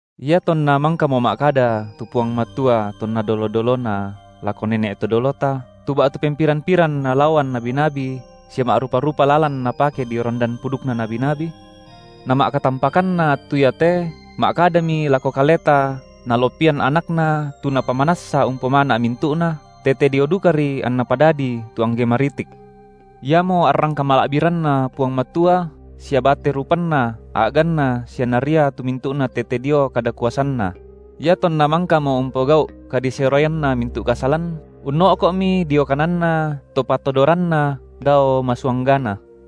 Iatonna mangkamo ma’kada tu Puang Matua tonna dolo-dolona lako nene’ to dolota tu ba’tu pempiran-piran nalaoan nabi-nabi sia ma’rupa-rupa lalan Napake dio randan pudukna nabi-nabi, nama’katampakanna attu iate, ma’kadaMi lako kaleta Nalopian AnakNa tu Napamanassa umpomana’ mintu’na, tete dio dukari anNa padadii tu angge maritik. Iamo arrang kamala’biranNa Puang Matua sia bate rupanna A’ganNa sia Naria tu mintu’na tete dio kada kuasanNa; iatonna mangkamo umpogau’ kadiseroianna mintu’ kasalan, unno’ko’mi dio kananNa To patodoranna dao masuanggana.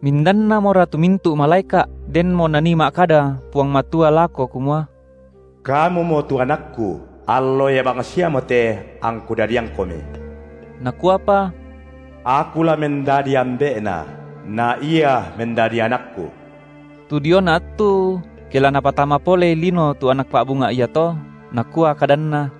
Mindannamora tu mintu’ malaeka’ denmo Nanii ma’kada Puang Matua lako kumua: Kamumo tu AnakKu, Allo ia bangsiamote angKu dadiangKomi; Nakuapa: Aku la mendadi Ambe’Na, na Ia mendadi AnakKu. Tu diona attu, ke la Napatama polei lino tu Anak pa’bunga’ iato, nakua kadanNa: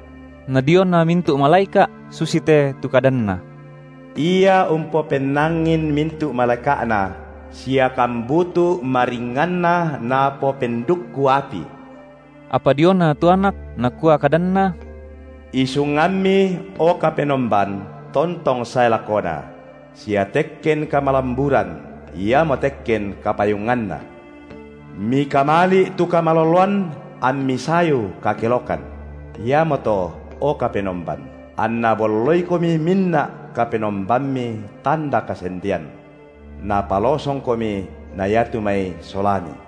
Na diona mintu’ malaeka’ susite tu kadanNa: Ia umpopennangin mintu’ malaeka’Na sia kambutu’ maringnganNa Napopendukku api; Apa diona tu Anak nakua kadanNa: IsungamMi, o Kapenomban, tontong sae lakona; sia tekken kamalamburan iamo tekken kapayunganNa. Mikamali’ tu kamaloloan amMi sayu kakelokan: iamoto, o Kapenomban, anna bolloiKomi minna’ KapenombamMi tanda kasendean. NapalosongKomi na iatu mai solaMi.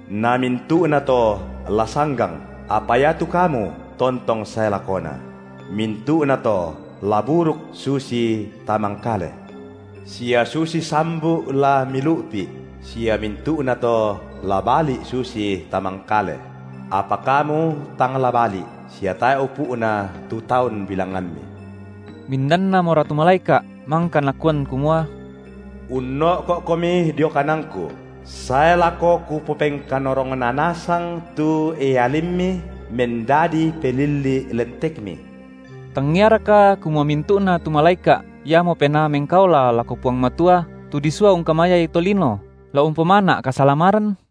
Na mintu’nato la sanggang, apa iatu Kamu tontong sae lakona; mintu’nato la buruk susi tamangkale, sia susi sambu’ la Milu’pi’, sia mintu’nato la bali’ susi tamangkale; apa Kamu tang la bali’, sia tae’ upu’na tu taun bilangamMi. Mindannamora tu malaeka’ mangka Nakuan kumua: Unno’ko’Komi dio kananKu, sae lako Kupopengkanorongna nasang tu ealimMi mendadi pelilli’ lentekMi? Tangiaraka kumua mintu’na tu malaeka’ iamo penaa mengkaola lako Puang Matua, tu disua ungkamayai tolino, la umpomana’ kasalamaran?